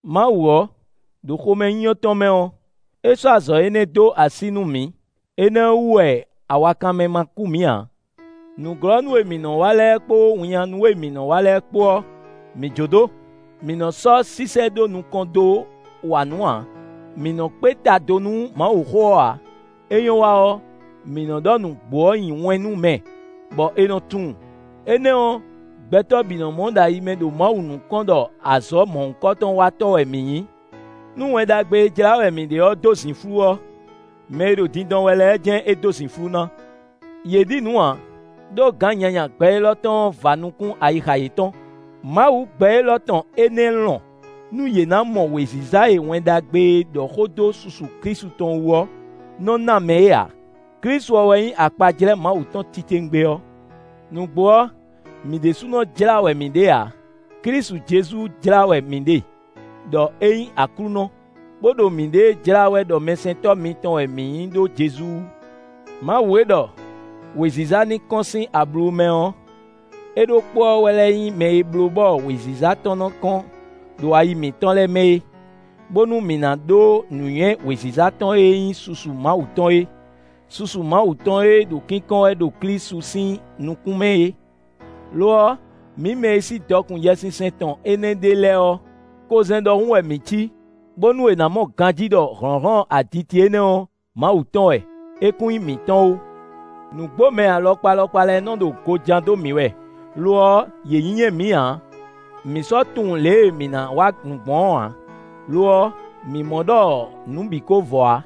Mawu ɔ́, ɖo xomɛnyínyɔ́ tɔn mɛ ɔ́, é sɔ́ azɔ̌ énɛ́ dó así nú mǐ; énɛ́ ɔ́ wú wɛ awakanmɛ ma kú mǐ ǎ. Nǔglɔ́nú e mǐ nɔ wa lɛ́ɛ kpó winnyánú e mǐ nɔ́ wa lɛ́ɛ kpó ɔ́, mǐ jó dó; mǐ nɔ sɔ́ sísɛ́ ɖó nukɔn dó wa nǔ ǎ; mǐ nɔ́ kpé ta do nú Mawuxó ɔ́ ǎ; é nyɔ́ wa ɔ́, mǐ nɔ́ ɖɔ nǔgbó ɔ́ nyi wɛn nú mɛ, bɔ è nɔ tunwun; énɛ́ ɔ́, gbɛtɔ́ bǐ nɔ mɔ ɖo ayi mɛ ɖo Mawu nukɔn ɖɔ azɔ̌ mɔ̌hunkɔtɔn wa tɔ́ wɛ mǐ nyí. Nú Wɛn Ɖagbe e jlá wɛ mǐ ɖe ɔ́ dó zǐnflú ɔ́, mɛ e ɖo dindɔn wɛ lɛ́ɛ jɛ́n é dó zǐnflú ná. Yě ɖi nǔ ǎ; ɖó gǎn nyanya gbɛ élɔ́ tɔn ɔ́ va nukún ayixa yětɔn. Mawu gbɛ élɔ́ tɔn énɛ́ nɔ lɔn nú yě ná mɔ wěziza e Wɛn Ɖagbe e ɖɔ xó dó susu Klísu tɔn wú ɔ́ nɔ ná mɛ é ǎ. Klísu ɔ́ wɛ nyí akpajlɛ́ Mawu tɔn titewungbe ɔ́. Nǔgbó ɔ́, mǐ ɖésúnɔ jlá wɛ mǐ ɖe ǎ: Klísu Jezu jlá wɛ mǐ ɖe ɖɔ é nyí Aklúnɔ, bó ɖo mǐɖée jlá wɛ ɖɔ mɛsɛntɔ́ mitɔn wɛ mǐ nyí ɖó Jezu wú. Mawu e ɖɔ: “Wěziza ní kɔ́n sín ablu mɛ” ɔ́, é ɖokpó ɔ́ wɛ lɛ́ nyí mɛ e bló bɔ wěziza tɔn nɔ kɔ́n ɖo ayi mǐtɔn lɛ́ɛ mɛ é, bónú mǐ ná ɖó nǔnywɛ́ wěziza tɔn e nyí susu Mawu tɔn é; susu Mawu tɔn e ɖo kínkɔ́n wɛ ɖo Klísu sín nukún mɛ é. Lo ɔ́, mǐ mɛ e sí dɔkun Yɛsinsɛn tɔn énɛ́ ɖe lɛ́ɛ ɔ́, kozɛ́n ɖɔhun wɛ mǐ cí, bónú è nǎ mɔ ganjí ɖɔ hlɔ̌nhlɔ́n aditi énɛ́ ɔ́, Mawu tɔn wɛ; é kún nyí mǐtɔn ó. Nǔgbomɛ alɔkpa alɔkpa lɛ́ɛ nɔ ɖo go ján dó mǐ wɛ; lo ɔ́, yě nyínyɛ́ mǐ ǎ; mǐ sɔ́ tunwun lě e mǐ ná wa nǔ gbɔn ɔ́ ǎ; lo ɔ́, mǐ mɔ ɖɔ nǔ bǐ ko vɔ ǎ.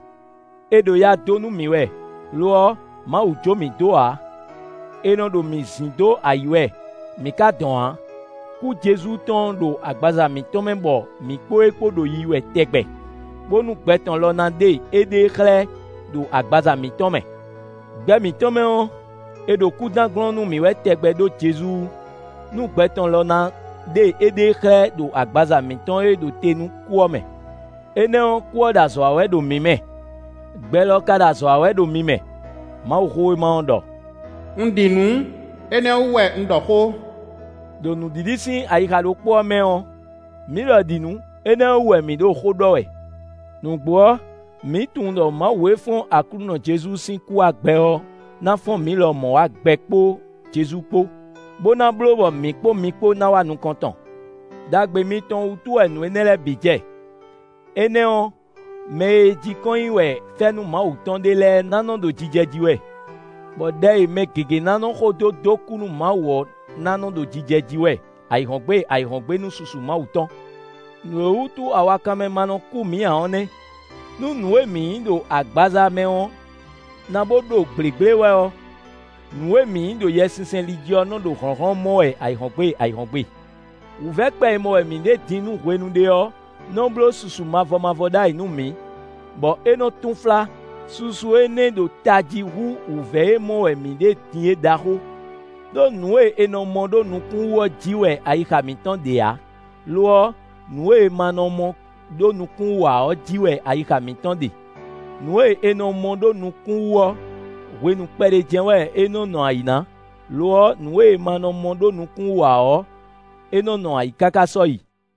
È ɖo ya dó nú mǐ wɛ; lo ɔ́, Mawu jó mǐ dó ǎ; è nɔ ɖo mǐ zín dó ayǐ wɛ, mǐ ka dɔn ǎ. Kú Jezu tɔn ɔ́ ɖo agbaza mǐtɔn mɛ bɔ mǐ kpó é kpó ɖo yiyi wɛ tɛgbɛ, bónú gbɛ tɔn lɔ ná ɖe éɖée xlɛ́ ɖo agbaza mǐtɔn mɛ. Gbɛ mǐtɔn mɛ ɔ́, è ɖo kúdán gblɔ́n nú mǐ wɛ tɛgbɛ ɖó Jezu wú, nú gbɛ tɔn lɔ ná ɖe éɖée xlɛ́ ɖo agbaza mǐtɔn e ɖo te nú kú ɔ́ mɛ. Énɛ́ ɔ́, kú ɔ́ ɖo azɔ̌ wa wɛ ɖo mǐ mɛ; gbɛ lɔ ka ɖo azɔ̌ wa wɛ ɖo mi mɛ. Mawuxówéma ɔ́ ɖɔ: “Un ɖi nǔ, énɛ́ ɔ́ wú wɛ un ɖɔ xó.” Đo nǔɖiɖi sín ayixa ɖokpó ɔ́ mɛ ɔ́, mǐ lɔ ɖi nǔ; énɛ́ ɔ́ wú wɛ mǐ ɖo xó ɖɔ wɛ. Nǔgbó ɔ́, mǐ tunwun ɖɔ Mawu e fɔ́n Aklúnɔ Jezu sín kú wá gbɛ ɔ́ ná fɔ́n mǐ lɔmɔ̌ wá gbɛ kpó Jezu kpó, bó ná bló bɔ mǐ kpó mi kpó ná wá nukɔn tɔn. Đagbe mitɔn wútu wɛ nǔ énɛ́ lɛ́ɛ bǐ jɛ; énɛ́ ɔ́, mɛ e jí kɔn nyi wɛ fɛ́nú Mawu tɔn ɖe lɛ́ɛ ná nɔ́ ɖo jijɛ jí wɛ, bɔ ɖɛ e mɛ gěgé ná nɔ́ xo dó dó kú nú Mawu ɔ́ ná nɔ́ ɖo jijɛ jí wɛ ayǐhɔ́ngbe ayǐhɔ́ngbe nú susu Mawu tɔn. Nǔ e wútu awakanmɛ ma nɔ kú mǐ ǎ ɔ́ nɛ́. Nú nǔ e mǐ nyǐ ɖo agbaza mɛ ɔ́ ná bo ɖo gblěgblé wɛ ɔ́, nǔ e mǐ nyí ɖo Yɛsinsɛn li jí ɔ́ nɔ ɖo hlɔ̌nhlɔ́n mɔ wɛ ayǐhɔ́ngbe ayǐhɔ́ngbe. Wǔvɛ́ kpɛ e mɔ wɛ mǐ ɖe din nú hwenu ɖé ɔ́ nɔ́ bló susu mavɔ mavɔ ɖ'ayǐ nú mǐ, bɔ é nɔ́ túnflá; susu énɛ́ ɖo tají hú wǔvɛ́ e mɔ wɛ mǐ ɖe din é ɖaxó. Đó nǔ e è nɔ mɔ ɖó nukún wú ɔ́ jí wɛ ayixa mǐtɔn ɖe ǎ; lo ɔ́, nǔ e è ma nɔ mɔ ɖó nukún wú ǎ ɔ́ jí wɛ ayixa mǐtɔn ɖe. Nǔ e è nɔ mɔ ɖó nukún wú ɔ́, hwenu kpɛɖé jɛ́n wɛ é nɔ́ nɔ ayǐ ná; lo ɔ́, nǔ e è ma nɔ mɔ ɖó nukún wú ǎ ɔ́, é nɔ́ nɔ ayǐ káká sɔ́yi.